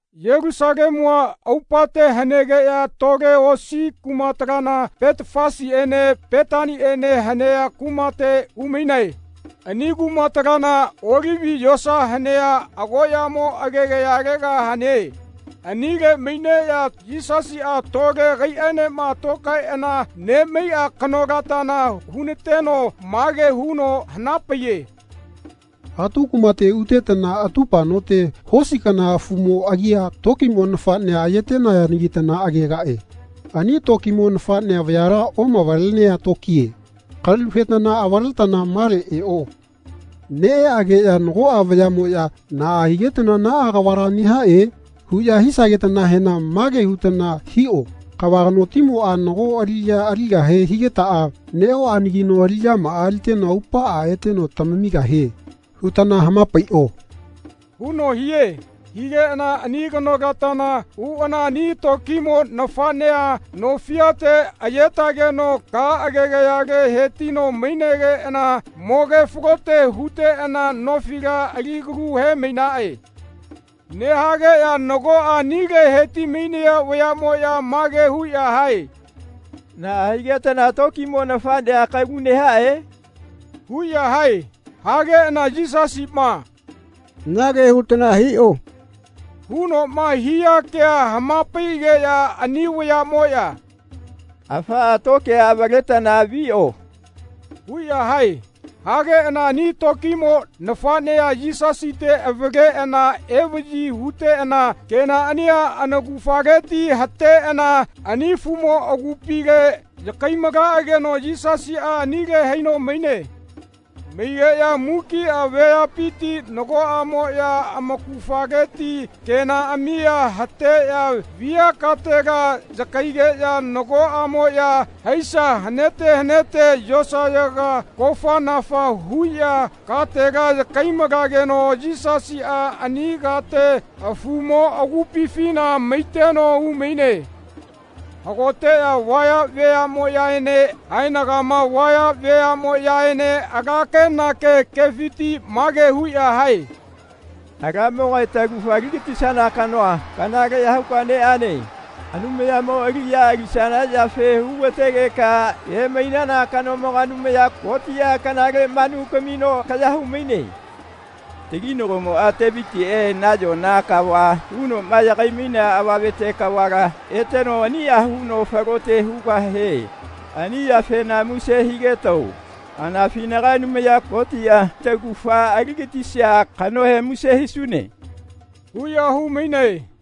Yelusalemua aupate hanegeꞌya tole osi kumatalana Petafasiene Petaniene hanea kumate umainae. Ani kumatalana Olivi yosa hanea agoꞌyamo agegayalega hane. Anile maineꞌya Yisasiꞌa tole agaiꞌaenema tokaeꞌana nemaiꞌa kanolatana hunateno mage huno hanapaiye “Atu kumate utetana atupa note hosi kana afumo agia tokimo nafaꞌnea ayetenayanagitana agegaꞌe. Ani tokimo nafaꞌnea vayala oꞌamavalenea tokie. Kalu hetana avaletana male eꞌo. Neꞌeꞌageꞌya nagoꞌa vayaꞌmoꞌya ‘Naꞌa higetana naꞌa kavala nehaꞌe?’ huꞌya hisagetanahena mage hutana hiꞌo ‘Kava kanotimoꞌa nago aliꞌya aligahe higetaꞌa neꞌoꞌanagino aliꞌyamaꞌa aliteno aupaꞌa eteno tamamigahie.’ hutana hamapaiꞌo.” huno hie. Higeꞌana ani kanolatana uꞌana ani tokimo nafaꞌnea no fiate ayetageno ka agegayale hetino mainegeꞌana mogefalote huteꞌana nofila alikalu hemainaꞌe. Nehaꞌageꞌya nagoꞌa anile hetimainaya vayaꞌmoꞌya mage huꞌya hae “Naꞌa higetana tokimo nafaꞌnea kalu nehaꞌe?” huꞌya hae. Hageꞌana Yisasiꞌma “Nage hutana hiꞌo.” hunoꞌma hia kea hamapaiꞌageꞌya ani vayaꞌmoꞌya “Afaꞌa tokia avaletana viꞌo.” huꞌya hae. Hageꞌana ani tokimo nafaꞌnea Yisasite avaleꞌana evaꞌyi huteꞌana kenaꞌania anaugafaleti hateꞌana ani afumo agupile yakaimalaꞌageno Yisasiꞌa anile haino maine. Maigeꞌya mukiꞌa veapiti nagoꞌamoꞌya amaugafaleti kenaꞌamia hateꞌya via katela yakaigeꞌya nagoꞌamoꞌya haisa hanete hanete yosayaga kofanafa huꞌya katela yakaimalageno Yisasiꞌa ani kate afumo agupifina maiteno umaine. Hagoteꞌya vaya veaꞌmoꞌyaene haenagama vaya veaꞌmoꞌyaene ala kenake kefiti mage huꞌya hae “Alamogae taugafa aligatisana kanoa kanaleꞌya huka neꞌane. Anumayamo aliꞌya alisana yafe hugategeka emainana kanomoga Anumaya Kotiꞌa kanale manu kamino kaya humaine. Taginagomoꞌa Tevitiꞌe nayona kava hunoꞌma yagaimainea avamete kavala eteno aniꞌa huno falote hugahie. Ani yafena muse higetao. Anafinaga Anumaya Kotiꞌa taugafa aligatisia kanohe muse hisune.” huꞌya humainae.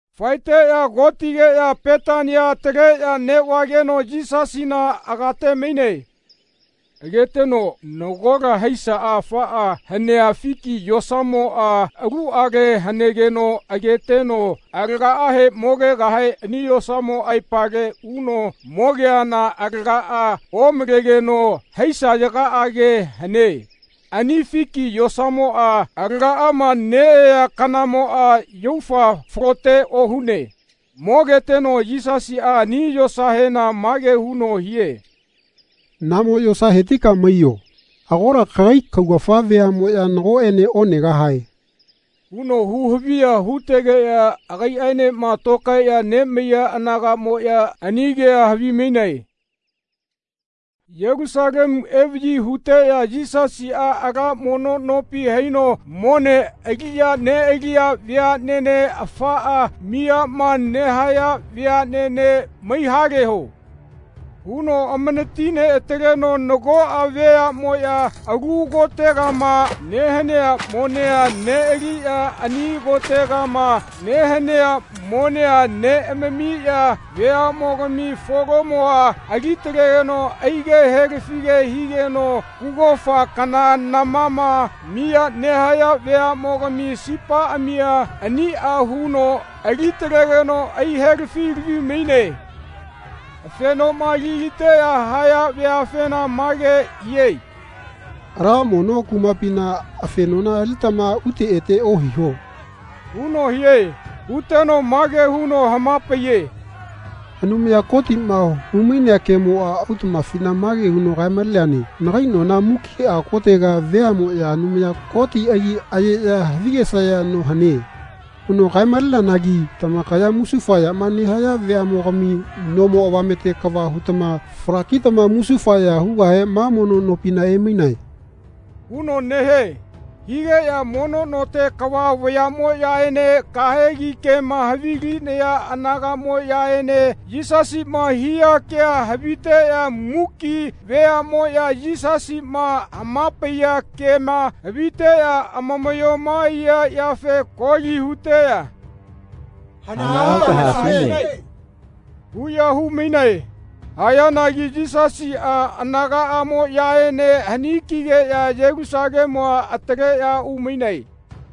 Faeteꞌya kotigeꞌya Petania ataleꞌya neꞌvageno Yisasina agatemaine. Agategeno nagola haisa afaꞌa hanea fiki yosamoꞌa aluꞌale hanegeno ageteno alagaꞌahe mogegahe ani yosamo aepale uno mogeana alagaꞌa omalegeno haisayagaꞌage hane. Ani fiki yosamoꞌa alagaꞌama neꞌayea kanamoꞌa yaufa falote ohune. Mogeteno Yisasiꞌa ani yosahena mage huno hie “Namo yosa hetika maiyo. Agola kagai kaugafa veaꞌmoꞌya nagoꞌene onegahae.” huno huhaviya hutegeꞌya agaiꞌaenema tokaeꞌya nemaiya anagaꞌmoꞌya ani kea havimainae. Yelusalemu evaꞌyi huteꞌya Yisasiꞌa ala mono nopi haino mone aliꞌya neꞌaliya veaꞌnene afaꞌa miyama nehaya veaꞌnene “Maihaleho.” huno amanatineꞌataleteno nagoꞌa veaꞌmoꞌya alu kotegama nehanea monea neꞌaliꞌya ani kotegama nehanea monea neꞌamamiya veaꞌmogami folomoa alitalegeno aige helafige higeno kugofa kana namama miya nehaya veaꞌmogami sipaꞌamia aniꞌa huno alitalegeno aihelafilavimaine. Afenoma aliliteꞌya nehaya veafena mage hie “Ala mono no kumapina afenona alitama ute ete ohiho.” huno hie. Huteno mage huno hamapaiye “Anumaya Kotiꞌma humainea kemoꞌa autaꞌmafina mage huno kaemaleneane ‘Nagai nona mukiꞌa kotega veaꞌmoꞌya Anumaya Koti agi ayeꞌya havigesaya no hane.’ huno kaemaleneanagi tamakaya musufa yama nehaya veaꞌmogami nomo avamete kava hutama falakitama musufa ya hugahe ma mono nopina emainae.” huno nehie. Higeꞌya mono note kava vayaꞌmoꞌyaene kahegi kema havilinaya anagaꞌmoꞌyaene Yisasiꞌma hia ke haviteꞌya muki veaꞌmoꞌya Yisasiꞌma hamapaiya kema haviteꞌya amamaꞌyoma aiya yafe koli huteꞌya “Hanaꞌa huta haesune.” huꞌya humainae. Hayanagi Yisasiꞌa anagaꞌamoꞌyaene hani kigeꞌya Yelusalemua ataleꞌya umainae.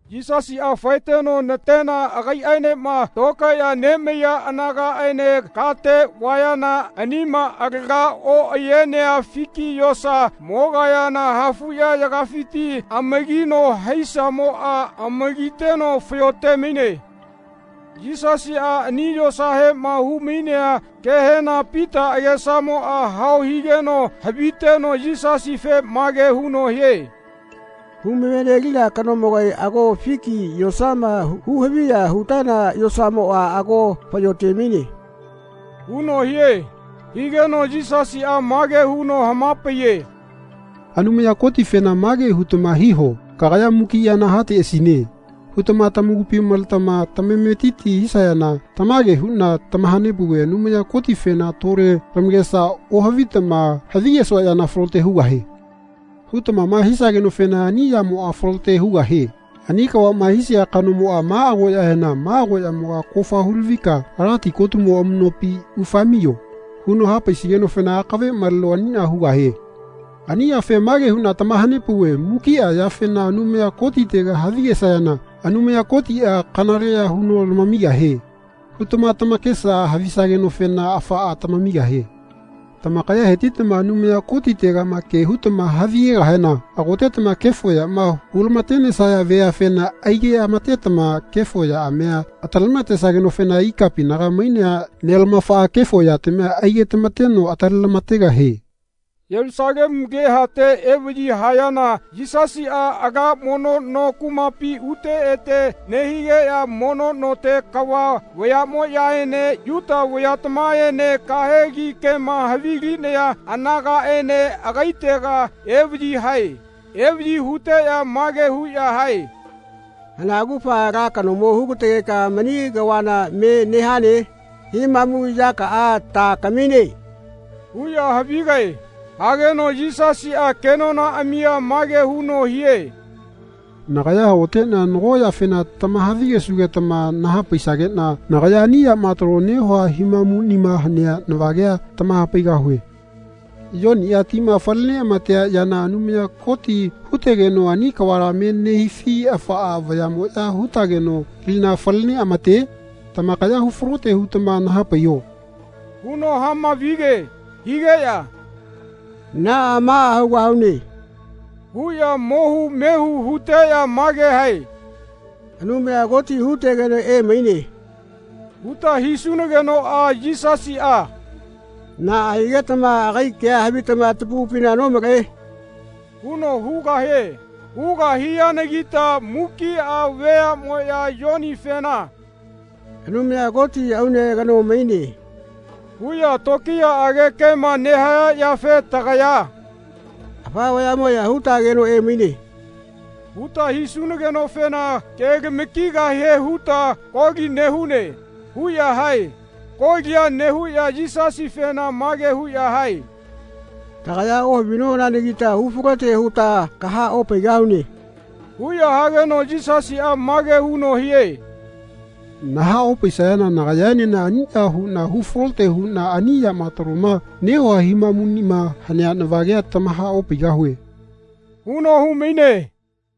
Yisasiꞌa faeteno natena agaiꞌaenema tokaeꞌya nemaiya anagaꞌaene kate vayana anima alaga oꞌayenea fiki yosa mogayana hafuꞌyayagafiti amagino haisamoꞌa amagiteno fayo temaine. Yisasiꞌa ani yosahema humainea kehena Pita agesamoꞌa hao higeno haviteno Yisasife mage huno hie “Humavenelina kanomogae ago fiki yosama huhaviya hutana yosamoꞌa ago faꞌyotemaine.” huno hie. Higeno Yisasiꞌa mage huno hamapaiye “Anumaya Kotifena mage hutama hiho ‘Kagaya mukiꞌa yana hateꞌasine.’ hutama tamakupi maletama tamametiti hisayana tamage huꞌna tamahanepauve Anumaya Kotifena tole lamakesa ohavitama ‘Havigesua yana falote hugahie.’ hutamama hisagenofena ani yamoꞌa falote hugahie. Ani kavaꞌma hisia kanomoꞌa ma agoꞌyahena ‘Ma agoꞌyamoga kofa hulavika ala tikotumo amuꞌnopi ufaemaiyo.’ huno hapaisigenofena akave maleno aniꞌa hugahie. Ani yafe mage huꞌna tamahanepauve mukiꞌa yafena Anumaya Kotitega havigesayana ‘Anumaya Kotiꞌa kanaleꞌya huno lamigahie.’ hutama tamakesa havisagenofena afaꞌa tamamigahie. Tamakaya hetitama Anumaya Kotitegama ke hutama havigegahena hagotetama kefo yama hulamatenesaya veafena aigeꞌamatetama kefo yaꞌamia atalematesagenofena ikapinaga mainea Nelamafaꞌa kefo yatamia aigetamateno atalelamategahie. Yelusalemu alehate evaꞌyi hayana Yisasiꞌa ala mono no kumapi ute ete nehigeꞌya mono note kava vayaꞌmoꞌyaene Yuta vayatamaene kahegi kema havilinaya anagaꞌene agaitega evaꞌyi hae. Evaꞌyi huteꞌya mage huꞌya hae “Hana augafa ala kanomo hugategeka mani kavala me nehane? Himamu yakaꞌa ta kamine?” huꞌya havigae. Hageno Yisasiꞌa kenonaꞌamia mage huno hie “Nagaya hagoteꞌna nago yafena tamahavigesugetama nahapaisageꞌna nagaya ani yama talo nehua himamuꞌnima hanea navagea tamahapaigahue. Yoniꞌa tima fale neꞌamatea yana Anumaya Koti hutegeno ani kavala me nehifi afa vayaꞌmoꞌya hutageno lina faleneꞌamate? Tamakaya hufalote hutama nahapaiho.” huno hamavige. Higeꞌya “Naꞌa maꞌa hugahune.” huꞌya mohu mehu huteꞌya mage hae “Anumaya Koti hutegeno emaine.” huta hisunagenoꞌa Yisasiꞌa “Naꞌa higetama agai kea havitama tamakupina nomalae?” huno hugahie. Hugahianagita mukiꞌa veaꞌmoꞌya Yonifena “Anumaya Koti aune kano maine.” huꞌya tokiyaꞌage kema nehaya yafe tagaya “Afa vayaꞌmoꞌya hutageno emaine.” huta hisunagenofena kelamakigahie huta koli nehune.” huꞌya hae. Kolia nehuꞌya Yisasifena mage huꞌya hae “Tagaya ohavinonanagita hufalote huta kahaꞌopaigahune.” huꞌya hageno Yisasiꞌa mage huno hie “Nahaꞌopaisayana nagayaenena aniꞌa huꞌna hufalote huꞌna ani yama taloma nehua himamuꞌnima hanea navagea tamahaꞌopaigahue.” huno humaine.